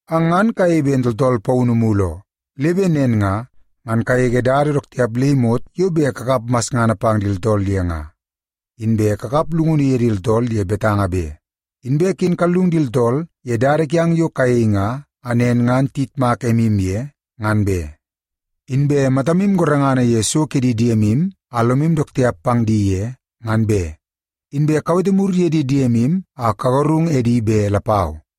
Ang ngan kayei ben tooltool paunu mulu oo, le bet nen nga, ngan kagege dada dook tiap le imot yo bet kakap masngana pang di tooltool ye nga. Inbe kakap llungunu ye di tooltool ye betanga be. Inbe ken kallung di tooltool ye dada kiang yo kayei nga a nen ngan tiyitmak emu ye, ngan be. Inbe matamu gorengana ye so ke di diemu a lomu dook tiap pang di ye, ngan be. Inbe kawete mur ye di diemu a kagarung edi be lapau.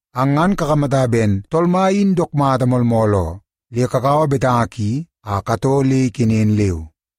Ang ngan kakamata ben Tool Mai in dook mata moolmool oo, le kakaua betanga ki a katoo le ikenen leu.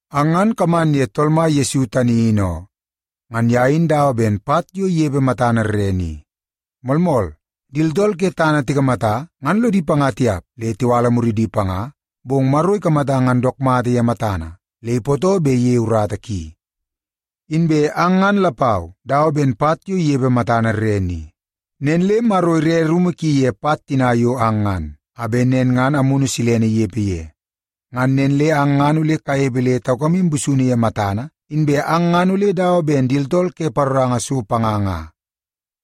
Ang ngan kaman ye Tool Mai Yesu tani in oo. Ngan ye in dawa ben pat yo inepe matana rrene i. Moolmool, di tooltool ke tana tikamata ngan lodi panga tiap le tiwala muridi panga, bong Maro ikamata ngan dook mata ye matana, le ipootoo bet iyei urata ki. Inbe ang ngan lapau dawa ben pat yo inepe matana rrene i. Nen le Maro ire rumu ki ye pat tina yo ang ngan, a bet nen ngan Amunu Silene inepe ye. Ngan nen le ang ngan ole kanepe le taukamu busunu ye matana, inbe ang ngan ole dawa ben di tooltool ke paroranga so panga nga.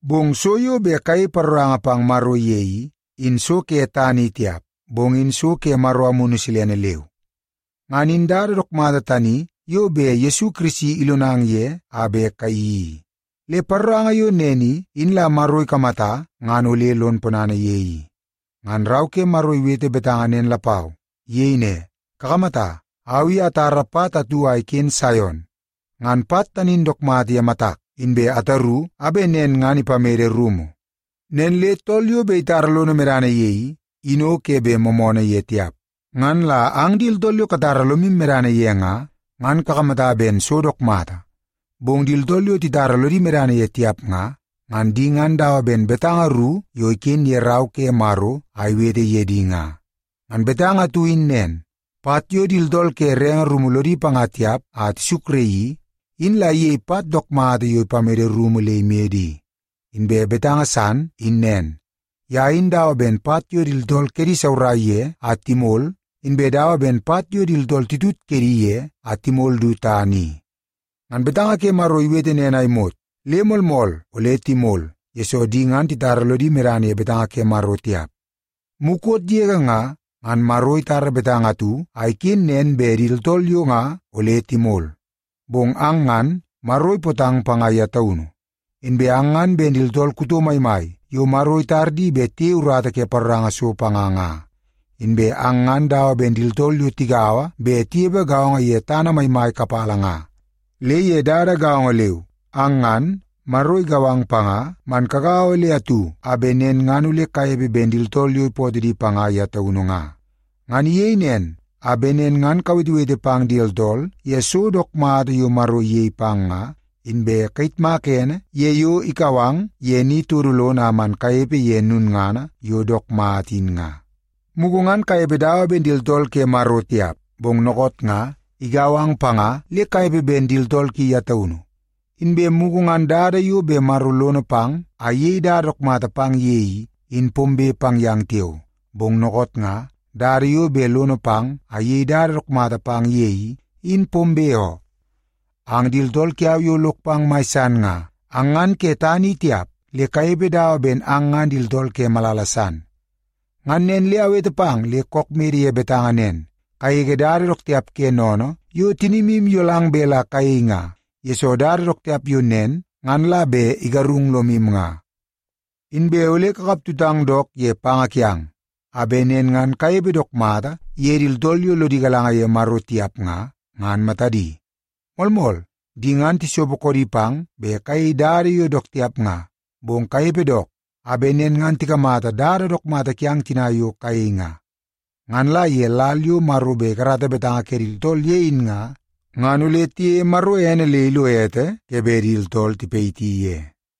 Bong so yo bet kayei paroranga pang Maro ye i, in so ke tana i tiap, bong in so ke Maro Amunu Silene leu. Ngan in dada dook mata tani yo bet Yesu Kirisi ilonang ye a bet kayeii i. Le paroranga yo nen i, in la Maro ikamata ngan ole lon ponana ye i. Ngan Rau ke Maro iwete betanga nen lapau. Iyei ne, “Kakamata, au i atara pat atu a iken Saion. Ngan pat tani in dook mata ye matak, inbe ataru a bet nen ngan ipamede rumu. Nen le tool yo bet itara lono medana ye i, in o ke bet moomoonoo ye tiap.” Ngan la ang di tooltool yo katara lomu medana ye nga, ngan kakamata ben so dook mata. Bong di tooltool yo titara lodi medana ye tiap nga, ngan di ngan dawa ben betanga ru yo iken ye Rau ke Maro a tiwete ye di nga. Ngan betanga atu in nen, “Pat yo di tooltool ke renge rumu lodi panga tiap a tisukraii i, in la iyei pat dook mata yo bet ipamede rumu le imede i.” Inbe betanga san in nen, “Ye in dawa ben pat yo di tooltool kedi isaurai ye a timol, inbe dawa ben pat yo di tooltool titut kedi ye a timol du tana i.” Ngan betanga ke Maro iwete nen a imot, le moolmool ole timol, yesoo di ngan titara lodi medana ye betanga ke Maro tiap. Mukot yege nga, ngan Maro itara betanga atu a iken nen bet di tooltool yo nga ole timol. Bong ang ngan, Maro ipootang panga ye taunu. Inbe ang ngan ben di tooltool kuto maimai yo Maro itar di bet tiyei urata ke paroranga so panga nga. Inbe ang ngan dawa ben di tooltool yo tigaua bet tinepe gaongo ye tana maimai kapala nga. Le ye dada gaongo leu, ang ngan, Maro igau ang panga man kagaua le atu a bet nen ngan ole kanepe ben di tooltool yo ipootoo di panga ye taunu nga. Ngan iyei nen, a bet nen ngan kawetewete pang di tooltool ye so dook mata yo Maro iyei pang nga, inbe kayitmaka ene ye yo ikau ang ye ni todo lono a kaman kanepe ye lulngana yo dook mata in nga. Mugu ngan kanepe dawa ben di tooltool ke Maro tiap, bong dookoot nga, igau ang panga le kanepe ben di tooltool ki ye taunu. Inbe mugu ngan dada yo bet Maro lono pang a iyei dada dook mata pang ye i, in pombe pang yang tiao. Bong dookoot nga, dada yo bet lono pang a iyei dada dook mata pang ye i, in pombe oo. Ang di tooltool kiau yo lok pang mai san nga, ang ngan ke tana i tiap, le kanepe dawa ben ang ngan di tooltool ke malala san. Ngan nen le awete pang le kook mede ye betanga nen, kagege dada dook tiap ke sennene yo tinimu iyolang bet la kayei nga, yesoo dada dook tiap yo nen ngan la bet igarung lomu nga. Inbe ole kakap tutang dook ye panga kiang, a bet nen ngan kanepe dook mata ye di tooltool yo lodi galanga ye Maro tiap nga, ngan matadi. Moolmool, di ngan tisopo koodi pang bet kayei dada yo dook tiap nga, bong kanepe dook, a bet nen ngan tikamata dada dook mata kiang tina yo kayei nga. Ngan la ye lal yo Maro bet ikarata betanga ke di tooltool ye in nga, ngan ole tiyeie Maro ene le ilo ete ke bet di tooltool tipayiti ye.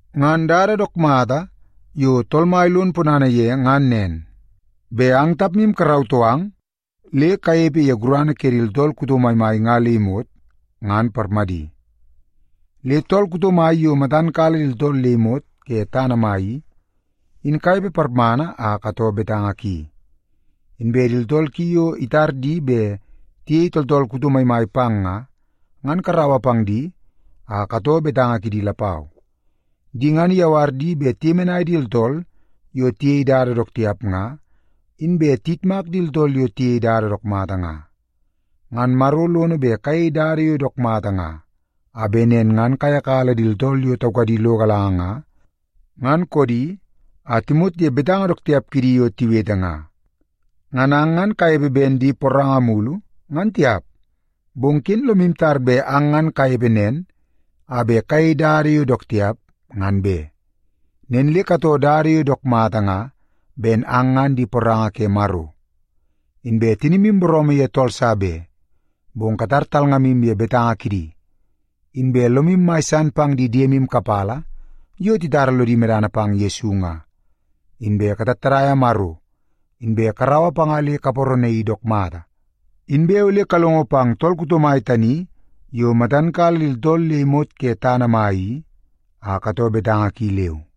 Ngan dada dook mata yo Tool Mai lon ponana ye ngan nen, bet ang tapmu karautoo ang le kanepe ye gurana ke di tooltool kuto maimai nga le imot, ngan parmadi. Le tool kuto mai yo matan kala di tooltool le imot ke tana mai i, in kanepe parmana a katoo betanga ki. Inbe di tooltool ki yo itar di bet tiyei tooltool kuto maimai pang nga, ngan karaua pang di a katoo betanga kidi lapau. Di ngan iyawar di bet tiyemenai di tooltool yo tiyei dada dook tiap nga, inbe tiyitmak di tooltool yo tiyei dada dook mata nga. Ngan Maro lono bet kayei dada yo dook mata nga, a bet nen ngan kayakala di tooltool yo taukadi lo galanga nga, ngan koodi, a timot ye betanga dook tiap kidi yo tiwete nga. Ngan ang ngan kanepe ben di poranga mulu, ngan tiap. Bong ken lomu tar bet ang ngan kanepe nen a bet kayei dada yo dook tiap, ngan be. Nen le katoo dada yo dook mata nga ben ang ngan di poranga ke Maro. Inbe tinimu booroomoo ye tool sa be, bong katar talngamu ye betanga kidi. Inbe lomu mai san pang di diemu kapala yo titara lodi medana pang Yesu nga. Inbe katattadaia Maro, inbe karaua panga le kaparanaii dook mata. Inbe ole kalongo pang tool kuto mai tani yo matan kala di tooltool le imot ke tana mai i, a katoo betanga ki leu.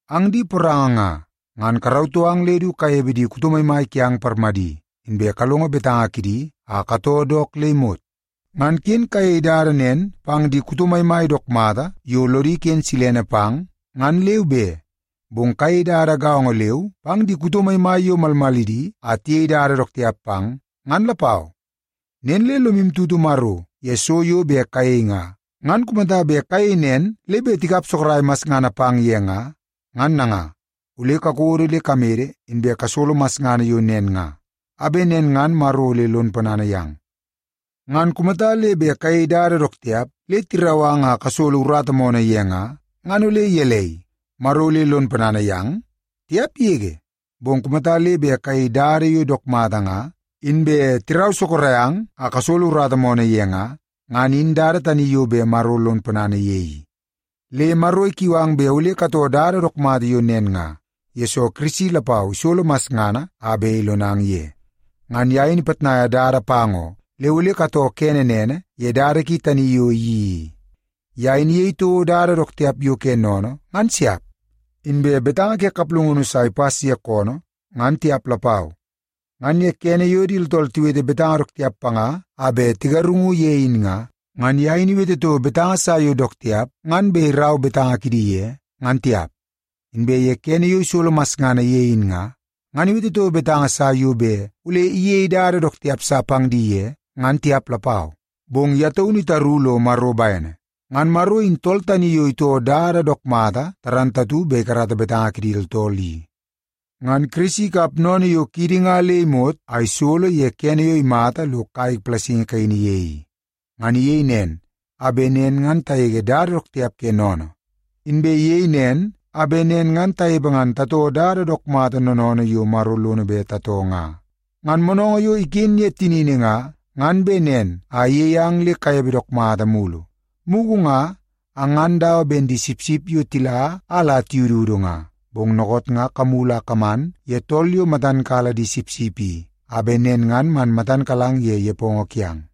Ang di poranga nga, ngan karautoo ang le du kanepe di kuto maimai kiang parmadi, inbe kalongo betanga kidi a katoo dook le imot. Ngan ken kayei dada nen pang di kuto maimai dook mata yo lodi iken silene pang, ngan leu be. Bong kayei dada gaongo leu pang di kuto maimai yo malmalidi a tiyei dada dook tiap pang, ngan lapau. Nen le lomu tutu Maro ye so yo bet kayei nga, ngan kumata bet kayei nen le bet tikap sorok masngana pang ye nga, ngan nanga, ole kakodo le kamede inbe kasolo masngana yo nen nga, a bet nen ngan Maro ole lon ponana yang. Ngan kumata le bet kayei dada dook tiap le tirau ang a kasolo urata moonoo ye nga, ngan ole gelei, Maro ole lon ponana yang? Tiap yege! Bong kumata le bet kayei dada yo dook mata nga, inbe tirau sorok ang a kasolo urata moonoo ye nga, ngan in dada tani yo bet Maro lon ponana ye i. Le Maro ikiu ang bet ole katoo dada dook mata yo nen nga, yesoo Kirisi lapau isolo masngana a bet ilonang ye. Ngan ye in ipitnaia dada pang oo, le ole katoo kene nene ye dada ki tani yo iyeii i. “Ye in iyei toko dada dook tiap yo ke sennene ngan siap. Inbe betanga ke kaplungunu sa ipas ye koonoo, ngan tiap lapau.” Ngan ye kene yo di tooltool tiwete betanga dook tiap panga a bet tigarungu ye in nga, ngan ye in iwete toko betanga sa yo dook tiap ngan bet irau betanga kidi ye, ngan tiap. Inbe ye kene yo isolo masngana ye in nga, ngan iwete toko betanga sa yo bet ole iyeie dada dook tiap sa pang di ye, ngan tiap lapau. Bong ye taunu itaru lo Maro bene. Ngan Maro in tool tani yo itoo dada dook mata bet ikarata betanga ke di tooltool i. Ngan Kirisi ikap sennene yo kiidi nga le imot a isolo ye kene yo imata lo kai palasingi kaini ye i. Ngan iyei nen, a bet nen ngan tagege dada dook tiap ke sennene. Inbe iyei nen, a bet nen ngan tanepe ngan tatoo dada dook mata noonoonoo yo Maro lono bet tatoo nga. Ngan moonoongoo yo iken ye tinini nga, ngan bet nen a iyei ang le kanepe dook mata mulu. Mugu nga ang ngan dawa ben di sipsip yo tila a la tiyududu nga, bong dookoot nga kamulu a kaman ye tool yo matan kala di sipsip i, a bet nen ngan man matan kalang ye nepongo kiang.